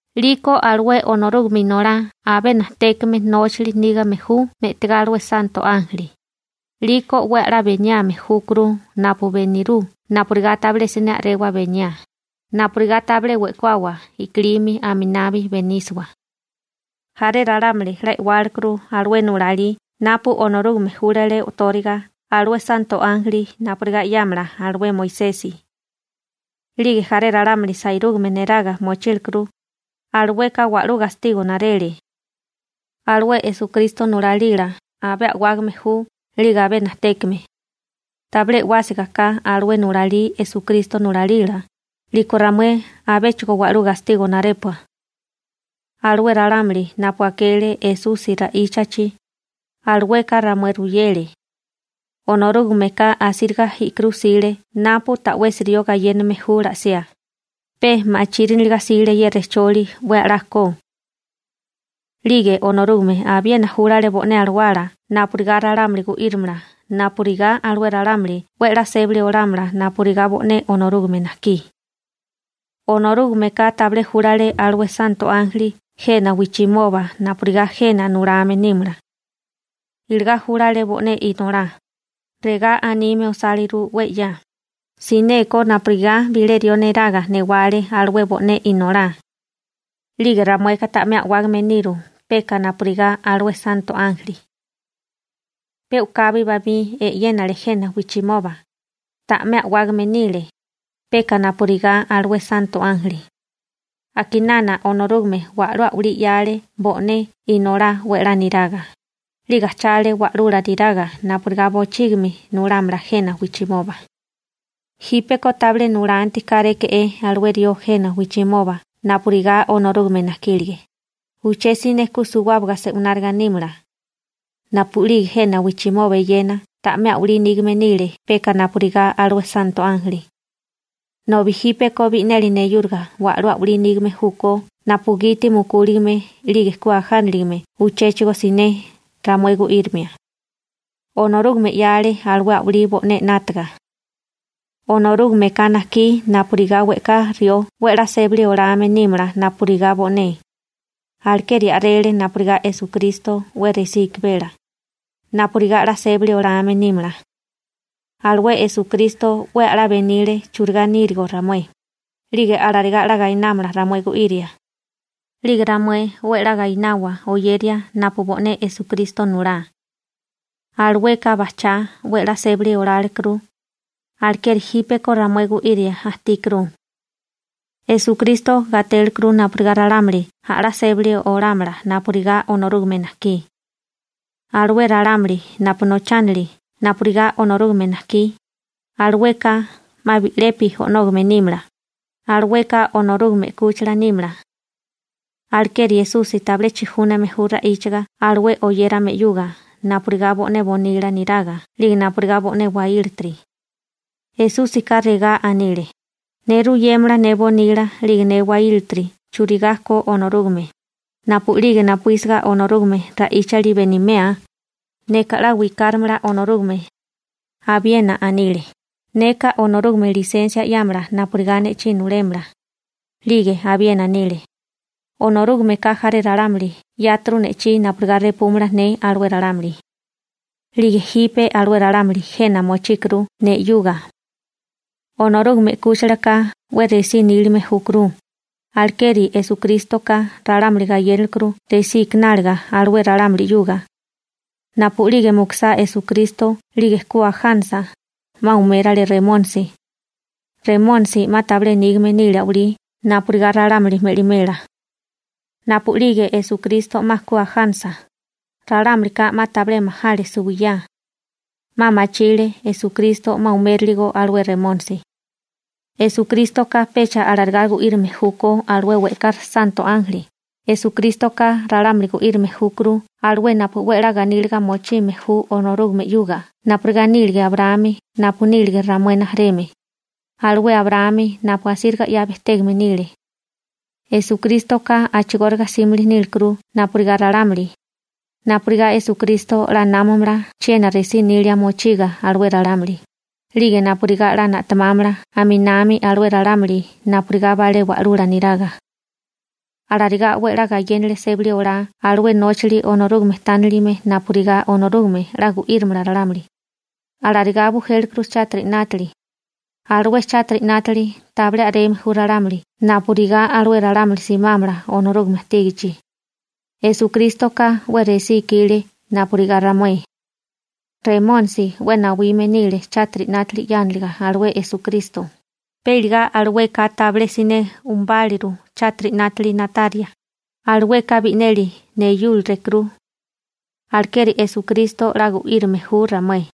'Liko alué Onorúgame Inolá abé najtékame nóchali nígame ju me'tigá alué santo ánjeli, 'liko 'we a'lá beniame júkuru napu benirú napurigá tabilé siné a'rewa beniá, napurigá tabilé we'kuawa i'kilimi, aminabi benísiwa. Jaré ralámuli 'la e'wálekuru alué nulalí napu Onorúgame júlale o'tóriga alué santo ánjeli napurigá 'yámala alué Moisesi, 'lige jaré ralámuli sairúgame neraga mochílekuru, alueka wa'lú gastigo narele. Alué Esukristo nulalila abé a'wágame ju 'lige abé najtékame. Tabilé e'wásigaká alué nulalí Esukristo nulalila, 'liko ramué abéchigo wa'lú gastigo narépua. Alué ralámuli napu akele Esusi ra'íchachi, alueka ramué ruyele. Onorúgameka asíriga i'kirú 'sile napu ta'wesi rió gayéname ju la'siá, pe machíriniliga 'sile ye rejcholi 'we a'lá ko. 'Lige Onorúgame abiena júlale bo'né alawala napurigá ralámuli gu'írimala napurigá alué ralámuli 'we 'la sébali olámala napurigá bo'né Onorúgame najkí. Onorúgameka tabilé júlale alué santo ánjeli jena wijchimoba napurigá jena nulame nímala. Iligá júlale bo'né Inolá. Regá anime osáliru 'we 'ya: Sineko napurigá bilé rió neraga newale alué bo'né Inolá, 'lige ramueka ta'mé a'wágame niru peka napurigá alué santo ánjeli. Pe u'kabi bamí e'yénale jena wijchimoba, ta'mé a'wágame nile, peka napurigá alué santo ánjeli. A'kinana Onorúgame wa'lú a'walí 'yale bo'né Inolá 'we 'la niraga, 'lige ajchale Wa'lula neraga napurigá bochígimi nulámala jena wijchimoba. Jípeko tabilé nulanti káréke'é alué rió jena wijchimoba napurigá Onorúgame najkílege, uché siné ku suwábaga se'wináriga nímala. Napu'lige jena wijchimoba eyena ta'mé a'walí nígame nile peka napurigá alué santo ánjeli. Nobi jípeko bi'neli neyúriga wa'lú a'walí nígame júkó napugiti mukúligame 'lige ku ajániligame uchéchigo siné ramué gu'írimia. Onorúgame 'yale alué a'walí bo'né 'nátaga. Onorúgameka najkí napurigá we'ká rió 'we a'lá sébali olame nímala napurigá bo'né, alekeri a'rele napurigá Esukristo 'we resí ikimela, napurigá 'la sébali olame nímala. Alué Esukristo 'we a'lá benile churigá nírigo ramué, 'lige alarigá 'la gainámala ramué gu'iria, 'lige ramué 'we a'lá gainawa oyeria napu bo'né Esukristo nulá. Alueka bajchá 'we 'la sébali olálekuru, alekeri jípeko ramué gu'iria ajtíkuru. Esukrístoka gatélekuru napurigá ralámuli a'lá sébali olámala napurigá Onorúgame najkí. Alué ralámuli napu nochánili napurigá Onorúgame najkí, alueka 'ma bi'lepi o'nógame nímala, alueka Onorúgame 'kúchila nímala. Alekeri Esusi tabilé chijúname ju ra'íchaga alué oyérame 'yuga napurigá bo'né bonila niraga 'lige napurigá bo'né waílatiri. Esúsika regá anile: Ne ruyémala ne bonila 'lige ne waílatiri churigá ko Onorúgame, napu'lige napuísiga Onorúgame nila ra'íchali benimea, neka 'la wikarámala Onorúgame. Abiena anile: Neka Onorúgame lisensia 'yámala napurigá ne'chí nulémala. 'Lige abiena anile: Onorúgameka jaré ralámuli 'yáturu ne'chí napurigá repúmala ne alué ralámuli. 'Lige jipe alué ralámuli jena mochíkuru ne 'yuga. Onorúgame 'kúchilaka 'we resí nílime júkuru, alekeri Esukrístoka ralámuli gayénalekuru resí ikináliga alué ralámuli 'yuga. Napu'lige mukusá Esukristo 'lige ku ajánasa, 'ma umérale Remónisi. Remónisi 'ma tabilé nígame nile a'walí napurigá ralámuli me'limela. Napu'lige Esukristo 'ma ku ajánasa, ralámulika 'ma tabilé majale suwiyá. 'Ma machile Esukristo 'ma umériligo alué Remónisi. Esukrístoka pecha alarigá gu'írame júkó alué we'ká santo ánjeli, Esukrístoka ralámuli gu'írame júkuru alué napu 'we a'lá ganíliga mochime ju Onorúgame 'yuga napurigá nílige Abraámi napu nílige ramué rijimala, alué Abraámi napu asíriga 'ya bejtégame nile. Esukrístoka a'chigóriga 'símili nílekuru napurigá ralámuli, napurigá Esukristo 'la námamala chiena resí nilia mochiga alué ralámuli, 'lige napurigá 'la na'temámala aminami alué ralámuli napurigá balé wa'lula neraga. Alarigá 'we a'lá gayénale sébali olá alué nóchali Onorúgame tánilime napurigá Onorúgame 'la gu'írimala ralámuli. Alarigá bujélekuru chátiri 'nátili. Alué chátiri 'nátili tabilé a'reme ju ralámuli napurigá alué ralámuli simámala Onorúgame ajtígichi. Esukrístoka 'we resí ikile napurigá ramué. Remónisi 'we nawime nile chátiri 'nátili 'yániliga alué Esukristo, pe iligá alueka tabilé siné umubáluru chátiri 'nátili na'taria, alueka bi'neli neyúralekuru. Alekeri Esukristo 'la gu'írame ju ramué.